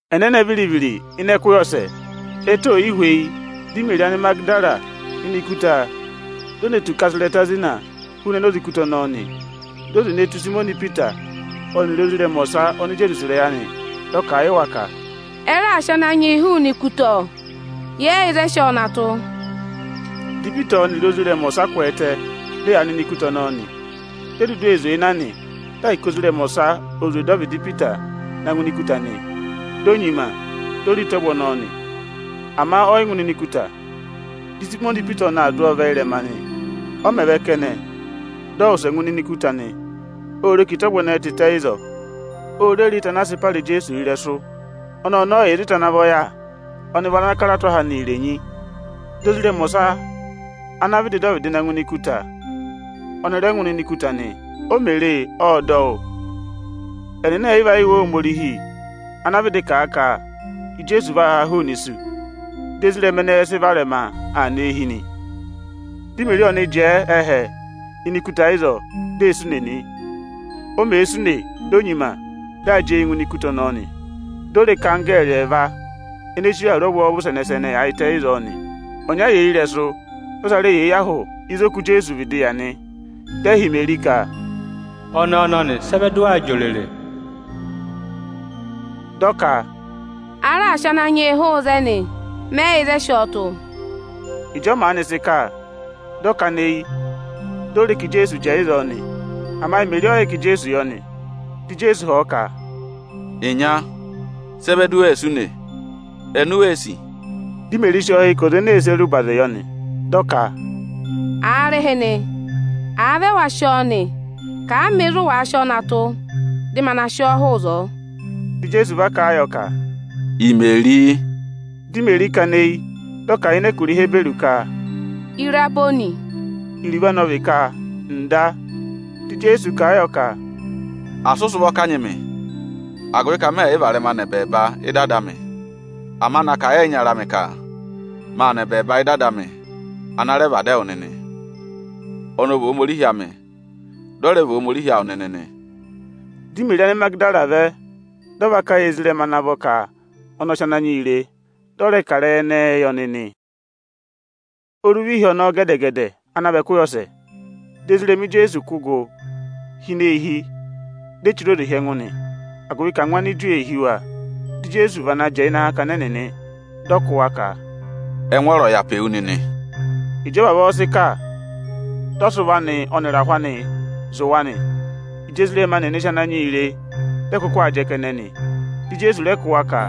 Ẹnẹnẹ viri-viri, ịnị ẹkụhị ọsẹ, ẹtẹ oò yi hweyi, dị Imeri Anịmagịdara nọ ini ikuta, di o ne tù ka a sị ịrẹta zina hụụnị enoze ikuta ọnọọ nị. Di o zwe ne tù Ịsayịmọnị Ipita ọnịrị ozirẹma ọsa oni Ijeesu sì ịrẹyị anị. Dị ọ kà a yị wa ka, “Ẹ raà sị Ananyị yị hụụnị ikuta, ọ! Yẹ yị yẹ ịzị ẹ sị ọọ na tụ́.” Dị Ipita ọnịrị ozirẹma ọsa kwẹẹtẹ, dị ẹyaa nọ ini ikuta ọnọọ nị. Ẹnị ẹyịva vi ene dudu ee zwee na, dị ahịka ozirẹma ọsa o zwe dọ ọvịdị Ipita na ngụ ini ikuta nị. Di o nyima, di o re ịta ọvụ ọnọọ nị; ama ọ yị ngụ ịnịnẹ ikuta. Dị Ịsayịmọnị Ipita ọnị aa dụ ọọ vẹ ịrẹma nị. Ọ mẹ̀ vẹ kẹnẹ, dị ọ wụsẹ ngụ ịnịnẹ ikuta nị. Ô re ka ịta ọvụ ẹnẹẹ tịtẹ ịzọọ. O re re ịta ana a sị para Ijeesu ịrẹsụ. Ọnọọ ọnị ọ yị yà ịzị ịta ana vọ yà; ọnị vị ana kara tụ́ aha anị irenyi. Di ozirẹma ọsa ana vịdị dọ ọvịdị na ngụ ini ikuta, ọnị rẹ ngụ ịnịnẹ ikuta nị. O mè re e, ộ dọ wụ́. Ẹnịnị ẹ̀ yị va yẹ Iwe Ohomorihi ana vịdị kà a ka Ijeesu vaa haa hụụnị isu. Di ezirẹma ẹnẹẹ sị varẹma aa nọ eehi nị. Di Imeri ọnị jẹẹ ẹhẹ ini ikuta ịzọọ, di ee sụ ùnè nị. O mèe sụ ùnè, di o nyima, dị aa jị eyii ngụ ini ikuta ọnọọ nị. Di o re ka anggẹẹrị ẹẹva ene chire awuru ọvwọọvụ sẹnẹ-sẹnẹ yaayịtẹ ịzọọ nị. Ọnya yà eyi ịrẹsụ, dị ọsa rẹ yà eyi ahụ ịzị oku Ijeesu vịdị yà nị. Dị ẹ họ̀ Imeri ka, “Ọnẹẹ ọnọnị, sị ẹ vẹ dị ụ waa jị òrèrè?” Dị ọ ka, “A raà sị Ananyị yị hụụ ịzẹnị, mẹ yị yẹ ịzị ẹ sị ọọ tụ́.” Ịjọọ maanị sị kà, dị ọ kana eyi, di o re ka Ijeesu jẹẹ ịzọọ nị. Ama Imeri ọ yị yẹ ka Ijeesu yọ nị. Dị Ijeesu họ̀ ọ ka, “Ịnya, sị ẹ vẹ di u wee sụ ùnè? Eni u wee sì?” Dị Imeri sị ọọ hị́ ka ọza ene ee sere ụbazị yọ nị. Dị ọ ka, “Aarịhịnị, àa vị ẹwa sị ọọ nị, kà a mị ịzị ụ wàa sị ọọ na tụ́, dị ma na sị ọọ hụụ ịzọọ!” Dị Ijeesu va kà a yọ ka, “Imeri!” Di Imeri kana eyi, dị ọ kà a ịnị ẹkụra Ihiburu ka, “Iraboni” (iruvo anị ọ vị “Iticha” à vị “Ọzwọzịsa”). Dị Ijeesu kà a yọ ka, “Asị ụ sị ụvọ kanyị mị, agụvị ka mẹ yị varẹma nọ ẹbẹẹba ị́dị Ada amị! Ama na kà a yị ẹyịnyara amị ka: maa nọ ẹbẹẹba ị́dị Ada amị ana rẹ vị Ada ẹwụ nịnị; ọnị ọ vị Ohomorihi amị, dị ọ rẹ vị Ohomorihi awụ nịnị nị.” Dị Imeri Anịmagịdara vẹ, dị ọ va kà a yị ezirẹma ana vọ ka ọnị ọ sị Ananyị yị re, dị ọ rẹ kà ịrẹyị ẹnẹnị yị ọnị nị. Oruva ịhị ọnọọ gẹdẹ-gẹdẹ ana vị ẹkụhị ọsẹ, dị ezirẹma Ijeesu kụ́ gụ hi ini eehi, di e chire oze hi ẹngụ nị, agụvị ka angwa Aniju nịnị ee hí wa. Dị Ijeesu vana va jẹẹ ịnị akakana ẹnịnị, dị ọ kụ́ wa ka, “Ẹngwọọrọ ọ̀ vị awụ nịnị!” Ịjị ọ vavọọ sị kà, dị ọ sị ụvọ anị ọnịrị akaha anị zụ̀ wa nị. Ịjị ezirẹma nịnị sị Ananyị yị re, dị ẹ kụkụ aa jẹ kẹnẹ nị. Dị Ijeesu rẹ kụ́ wa ka,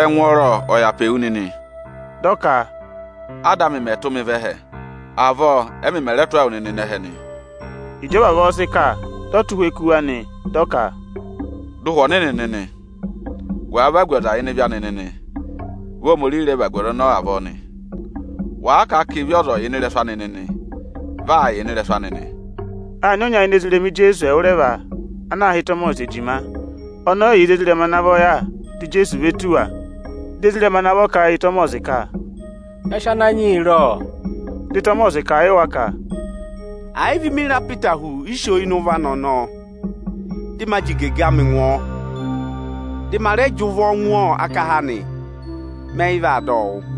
“Ẹngwọọrọ ọ̀ vị awụ nịnị!” Dị ọ ka, “Áda amị mẹ̀ tụ́ mị vẹ ẹhẹ, avọọ ẹ́mị mẹ̀ rẹ tụ́ ẹwụ nịnị aa nọ ẹhẹ nị.” Ịjị ọ vavọọ sị kà, dị ọ tụ́ ụhwẹ kú wa nị, dị ọ ka, “Dọ Ụhwẹ Ọnịnị nịnị! Wàa vagu ọza ịnị ịvị anị nịnị, vị Ohomorihi rẹ vagu ọza ọnọọ avọọ nị. Wàa kà a ka ịvị ọza yị yà ịnị ịrẹsụ anị nịnị, vị aa yà ịnị ịrẹsụ anị nị.” Â nyị ọnya ini ezirẹma Ijeesu ẹwụrẹva ana aā hị́ Ịtọmọsị Ejima. Ọnị ọ yị yà ịzị ezirẹma ana vọ yà dị Ijeesu ve tù wa. Di ezirẹma ana vọ kà a yị Ịtọmọsị ka, “Ya sị Ananyị yị re, ọ!” Dị Ịtọmọsị kà a yị wa ka, “Ẹ̀ yị vị mi re apịtahụ iso ịnị ụvọ anị, dị ma jị igege amị ngụ ọọ, dị ma rẹ jị ụvọ ngụ akaha anị, mẹ yị vaa dọ ọ wụ́.”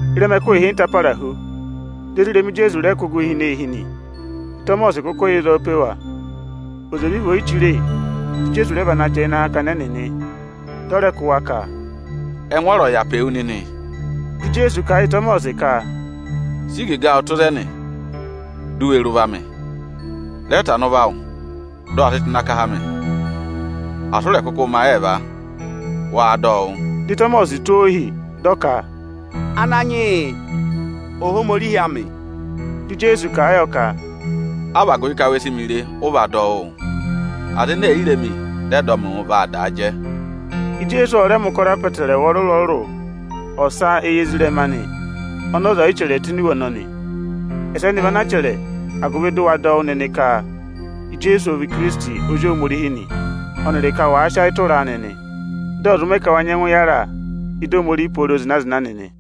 Ịrẹma ẹkụhị ịhịnta para hu, di ezirẹma Ijeesu rẹ kụ́ gụ hi ini eehi nị. Ịtọmọsị kụkụ yà ịzọọ pe wa. Oze vị vị oyichire, dị Ijeesu rẹ vana va jẹẹ ịnị akakana ẹnịnị nị. Dị ọ rẹ kụ́ wa ka, “Ẹngwọọrọ ọ̀ vị awụ nịnị!” Dị Ijeesu kà a yị Ịtọmọsị ka, “Sị igege awụ tụ́ ịzẹnị, di u we re ụvọ amị! Rẹ tana ụvọ awụ, dị ụ wa sị tụ́ ịnị akaha amị! Asị ụ rẹ̀ kụkụ mẹ ayị ẹẹva, waa dọ ọ wụ́!” Dị Ịtọmọsị tụ́ ọọ ohi, dị ọ ka, “Ananyị yị, Ohomorihi amị!” Dị Ijeesu kà a yọ ka, “A vị agụvị ka we si mi re, ụ va dọ wụ́ụ? Aza ene è yi re mi, dị ẹ dọ mị wụ́, vaa daa jẹ.” Ijeesu ọ rẹ mẹ̀ ụkọrọ apọtẹrẹwa ọrụrụ-ọrụrụ ọsa éyi ezirẹma anị ọnị ọza ọ̀ yị chẹrẹ tụ́ ini iwe ọnọnị. Ẹsẹnị vị ana a chẹrẹ, agụvị dị ụ wa dọ wụ́ nịnị ka Ijeesu ọ vị Ikirisiti Ozi Ohomorihi nị; ọnịrị ka wàa sị ayị tụra a nịnị, dị ọ̀ zụ mẹ ka wa nyẹngụ yàra ị́dị Ohomorihi pooro zịna-zịna nịnị.